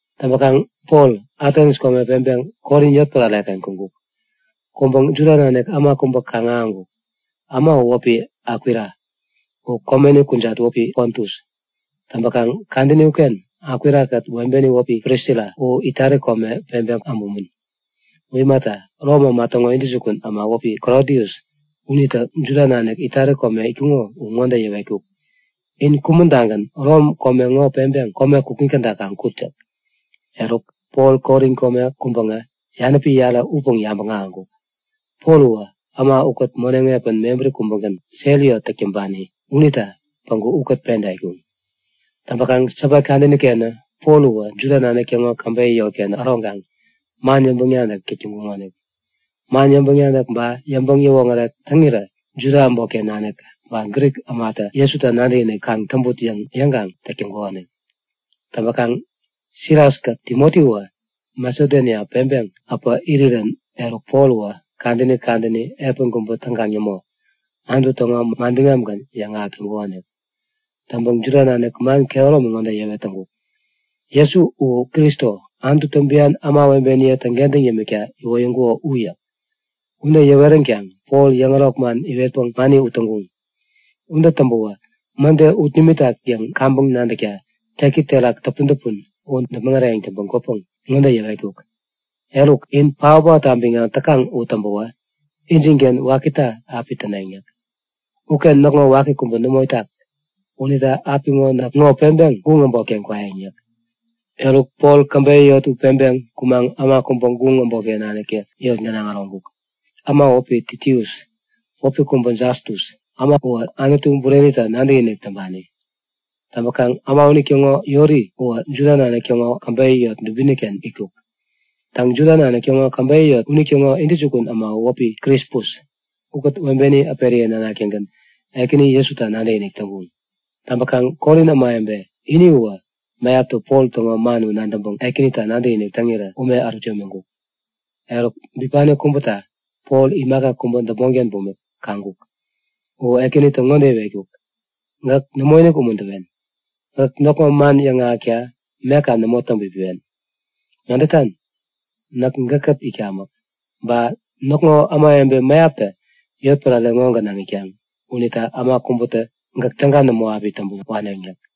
Täŋpäŋ Pol Atens kome peŋpeŋ Korin yotpärare-ken kuŋkuk. Kuŋpäŋ Juda nanik äma kubä kaŋ-ahäŋkuk. Äma u wäpi Akwila, u komeni kujat wäpi Pontus. Täŋpäkaŋ kadäni uken Akwila-kät webeni wäpi Prisila u Itali kome peŋpeŋ äbumän. U imata, Rom äma täŋo intäjukun äma wäpi Klodius unitä Juda nanik Itali kome itkuŋo u ŋode yäwetkuk; In kumän-tagän Rom kome ŋo peŋpeŋ kome kukŋi käda kaŋ kut yäk. Eruk, Pol Korin kome kuŋpäŋä yanäpi yarä upäŋ yabäŋ ahäŋkuk. Pol uwä äma ukät moneŋ epän mebäri kubägän, sel yot täk täŋpani unita päŋku ukät penta itkuŋ. Täŋpäkaŋ Sabat kadäni-kenä Pol uwä Juda nanik täŋo käbeyä yotken äroŋkaŋ man yäŋpäŋ-nadäk täk täŋkuŋonik. Man yäŋpäŋ-nadäk ba yäŋpäŋ-yäwoŋärek täŋira Juda äbotken nanik ba Grik ämatä Jesuta nadäkinik kaŋ täŋput yäŋ yäŋkaŋ täk täŋkukonik. Täŋpäkaŋ Silas-kät Timotiwä Masedonia peŋpeŋ äpä irirän eruk Pol uwä kadäni kadäni, epän kubä täŋkaŋ nämo, Anutu täŋo manbiŋamgän yäŋahäk täŋkukonik. Täŋpäŋ Juda nanik man kehäromi ŋode yäwet täŋkuk; Jesu u Kristo, Anututä bian ämawebeniye täŋkentäŋ yämikta iwoyäŋkuko u yäk. Ude yäweränkaŋ Pol yäŋärok man iwetpäŋ mani ut täŋkuŋ. Ude täŋpäwä mäde ut nimitak yäŋ kaŋpäŋ nadäkta teki terak täpun-täpun u däpmäŋ äreyäŋ täŋpän kwäpäŋ ŋode yäwetkuk; Eruk, in paot-paotta biŋam täkaŋ u täŋpäwä, injinken wakita api täneŋ yäk. Uken näkŋo waki kubä nämo itak. Unita apiŋo näk ŋo peŋpeŋ guŋ äbotken kwayäŋ yäk. Eruk Pol käbeyä yot u peŋpeŋ kumaŋ äma kubä guŋ äbotken naniktä yot gänaŋ äroŋkuk. Äma u wäpi Titius, wäpi kubä Jastus. Äma uwä Anutu Burenita nadäkinik täŋpani. Täŋpäkaŋ äma unitäŋo yori uwä Juda nanik täŋo käbeyä yot dubini-ken itkuk. Täŋ, Juda nanik täŋo käbeyä yot unitäŋo intäjukun äma u wäpi Krispus. Ukät webeni äperiye nanak-tägän Ekäni Jesuta nadäkinik täŋkuŋ. Täŋpäkaŋ Korin ämawebe ini uwä mäyaptä Pol täŋo man u nadäŋpäŋ Ekänita nadäkinik täŋirä ume ärut yämiŋkuk. Eruk bipani kubäta Pol imaka kubä däpmonken bumik kaŋkuk. U Ekänitä ŋode iwetkuk; Gäk nämoinik umuntäwen. Gäk näkŋo man yäŋahäkta meka nämo täŋpipiwen. Nadätan? Näk gäkkät itkamäk. Ba näkŋo ämawebe mäyaptä yotpärare ŋo gänaŋ itkaŋ unita äma kubätä gäk täga nämo api täŋpän wawen yäk.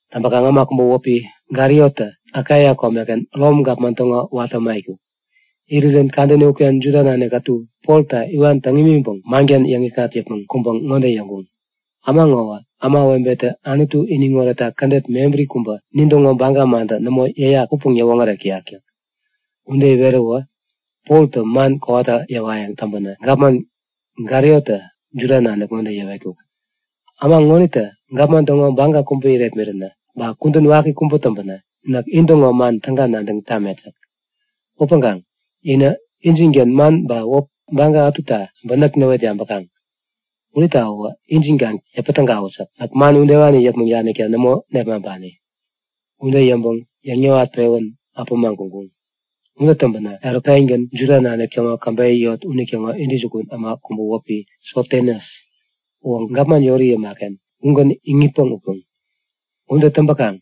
Täŋpäkaŋ äma kubä wäpi Galiotä Akaia komeken Rom gapman täŋo watä äma itkuk. Irirän kadäni uken Juda nanik ätu Polta iwan täŋ imiŋpäŋ manken yäŋikŋat yäpmäŋ kuŋpäŋ ŋode yäŋkuŋ; Äma ŋowä ämawebetä Anutu iniŋoretta kädet mebäri kubä, nintäŋo baga mantä nämo yäyak upäŋ yäwoŋärek täyak yäk. Ude iweräwä Poltä man kowata yäwayäŋ täŋpänä, gapman Galiotä Juda nanik ŋode yäwetkuk; Äma ŋonitä gapman täŋo baga kubä irepmiränä, ba kudän waki kubä täŋpänä, näk intäŋo man täga nadäŋ tamet yäk. Upäŋkaŋ inä injinken man ba wäp ba baga ätuta äbä näk näwet yabäkaŋ. Unita uwä injin kaŋ yäpä tägawut yäk. Näk man udewani yäpmäŋ danikta nämo nepmaŋpani. Ude yäŋpäŋ yäŋ-yäwat-pewän äpämaŋ kuŋkuŋ. Ude täŋpänä eruk pengän Juda nanik täŋo käbeyä yot unitäŋo intäjukun äma kubä wäpi Sostenes uwä gapman yori yäma-ken ugän iŋitpäŋ utkuŋ. Ude täŋpäkaŋ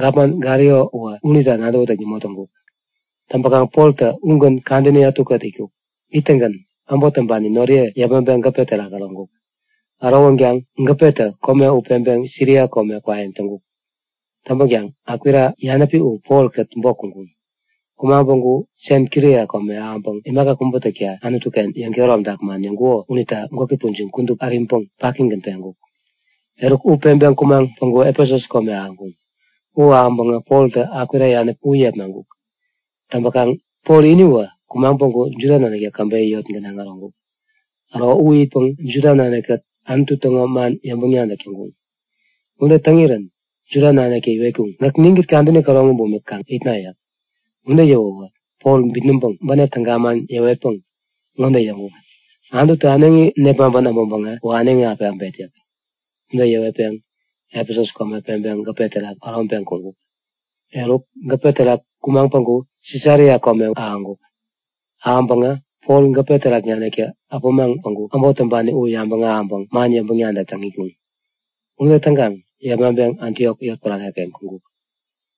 gapman Galio uwä unita nadäwätäk nämo täŋkuk. Täŋpäkaŋ Poltä ugän kadäni ätukät itkuk. Ittäŋgän äbot täŋpani noriye yepmaŋpeŋ gäpe terak äroŋkuk. Ärowänkaŋ gäpetä kome u peŋpeŋ Siria kome kwayäŋ täŋkuk. Täŋpäkaŋ Akwila yanäpi u Polkät bok kuŋkuŋ. Kumaŋ päŋku Senkria kome ahäŋpäŋ imaka kubä täkta Anutu-ken yäŋkehäromtak man yäŋkuko unita gwäki pujiŋ kudup äriŋpäŋ pakigän peŋkuk. Eruk, u peŋpeŋ kumaŋ päŋku Efesus kome ahäŋkuŋ. U ahäŋpäŋä, Poltä Akwila yanäpi u yepmaŋkuk. Täŋpäkaŋ Pol iniwä kumaŋ päŋku Juda naniktä käbeyä yot gänaŋ äroŋkuk. Äro u itpäŋ Juda nanikkät Anutu täŋo man yäŋpäŋ-nadäk täŋkuŋ. Ude täŋirän Juda naniktä iwetkuŋ; Gäk ninkät kadäni käroŋi bumik kaŋ itna yäk. Ude yäwäwä Pol bitnäŋpäŋ bänep täga mangän yäwetpäŋ ŋode yäŋkuk; Anututä äneŋi nepmaŋpän äbäŋpäŋä, uwä äneŋi api äbet yäk. Ude yäwetpäŋ Efesus kome peŋpeŋ gäpe terak äroŋpeŋ kuŋkuk. Eruk gäpe terak kumaŋ päŋku Sisaria kome ahäŋkuk. Ahäŋpäŋä Pol gäpe terak naniktä äpämaŋ päŋku äbot täŋpani u yabäŋ ahäŋpäŋ man yäŋpäŋ-nadäk täŋ itkuŋ. Ude täŋkaŋ yepmaŋpeŋ Antiok yotpärare-ken kuŋkuk.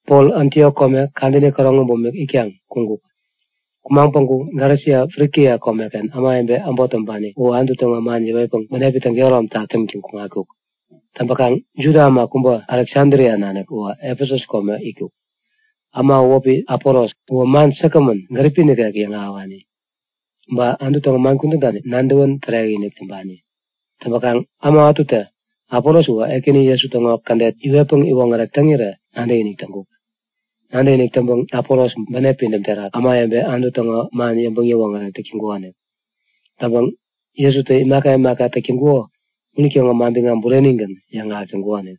Pol Antiok kome kadäni käroŋi bumik itkaŋ kuŋkuk. Kumaŋ päŋku Galesia Frikia komeken ämawebe äbot täŋpani u Anutu täŋo man yäwetpäŋ bänepi täŋ-kehäromtak täŋtäŋ kuŋatkuk. Täŋpäkaŋ Juda äma kubä Aleksadria nanik uwä Efesus kome itkuk. Äma u wäpi Apolos. Uwä man säkgämän, gäripi nikek yäŋahäwani, ba Anutu täŋo man kudänta nadäwän tärekinik täŋpani. Täŋpäkaŋ äma ätutä Apolos uwä Ekäni Jesu täŋo kädet iwetpäŋ iwoŋärek täŋirä nadäkinik täŋkuk. Nadäkinik täŋpäŋ Apolos bänep pidäm terak ämawebe Anutu täŋo man yäŋpäŋ-yäwoŋärek täk täŋkukonik. Täŋpäŋ Jesutä imaka imaka täk täŋkuko unitäŋo manbiŋam burenigän yäŋahäk täŋkukonik.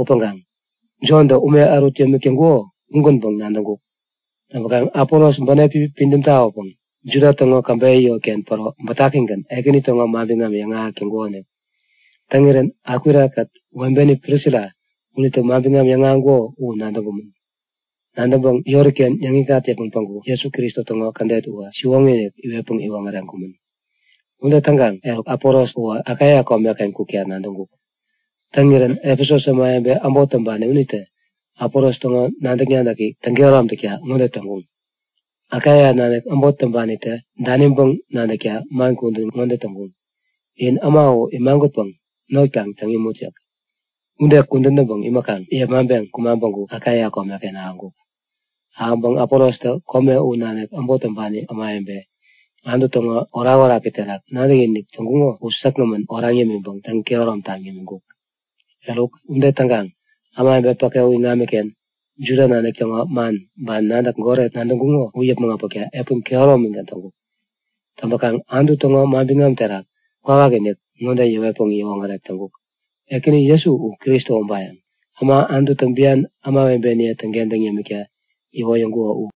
Upäŋkaŋ Jontä ume ärut yämik täŋkuko ugänpäŋ nadäŋkuk. Täŋkaŋ Apolos bänepi pidäm tawäpäŋ Juda täŋo käbeyä yotken päro bätakigän Ekäni täŋo manbiŋam yäŋahäk täŋkukonik. Täŋirän Akwila-kät webeni Prisila unitä manbiŋam yäŋahäŋkuko u nadäŋkumän. Nadäŋpäŋ yori-ken yäŋikŋat yäpmäŋ päŋku Jesu Kristo täŋo kädet uwä siwoŋi-inik iwetpäŋ iwoŋäreŋkumän. Ude täŋkaŋ eruk Apolos uwä Akaia komen-ken kukta nadäŋkuk. Täŋirän Efesus ämawebe äbot täŋpani unitä Apolos täŋo nadäk-nadäki täŋkehärom takta ŋode täŋkuŋ; Akaia nanik äbot täŋpanitä daniŋpäŋ nadäkta man kudän ŋode täŋkuŋ; In äma u imagutpäŋ not kaŋ täŋ imut yäk. Ude kudän täŋpäŋ imäkaŋ yepmaŋpeŋ kumaŋ päŋku Akaia komeken ahäŋkuk. Ahäŋpäŋ Apolostä kome u nanik äbot täŋpani ämawebe, Anutu täŋo orakoraki terak nadäkinik täŋkuŋo u säkgämän oraŋ yämiŋpäŋ täŋ-kehäromtaŋ yämiŋkuk. Eruk, ude täŋkaŋ ämawebe päke u iŋamiken Juda nanik täŋo man ba nadäk goret nadäŋkuŋo u yäpmäŋ äpäkta epän kehäromigän täŋkuk. Täŋpäkaŋ Anutu täŋo manbiŋam terak kwawakinik ŋode yäwetpäŋ yäwoŋärek täŋkuk; Ekäni Jesu u Kristo ubayäŋ, äma Anututä bian ämawebeniye täŋkentäŋ yämikta iwoyäŋkuko u.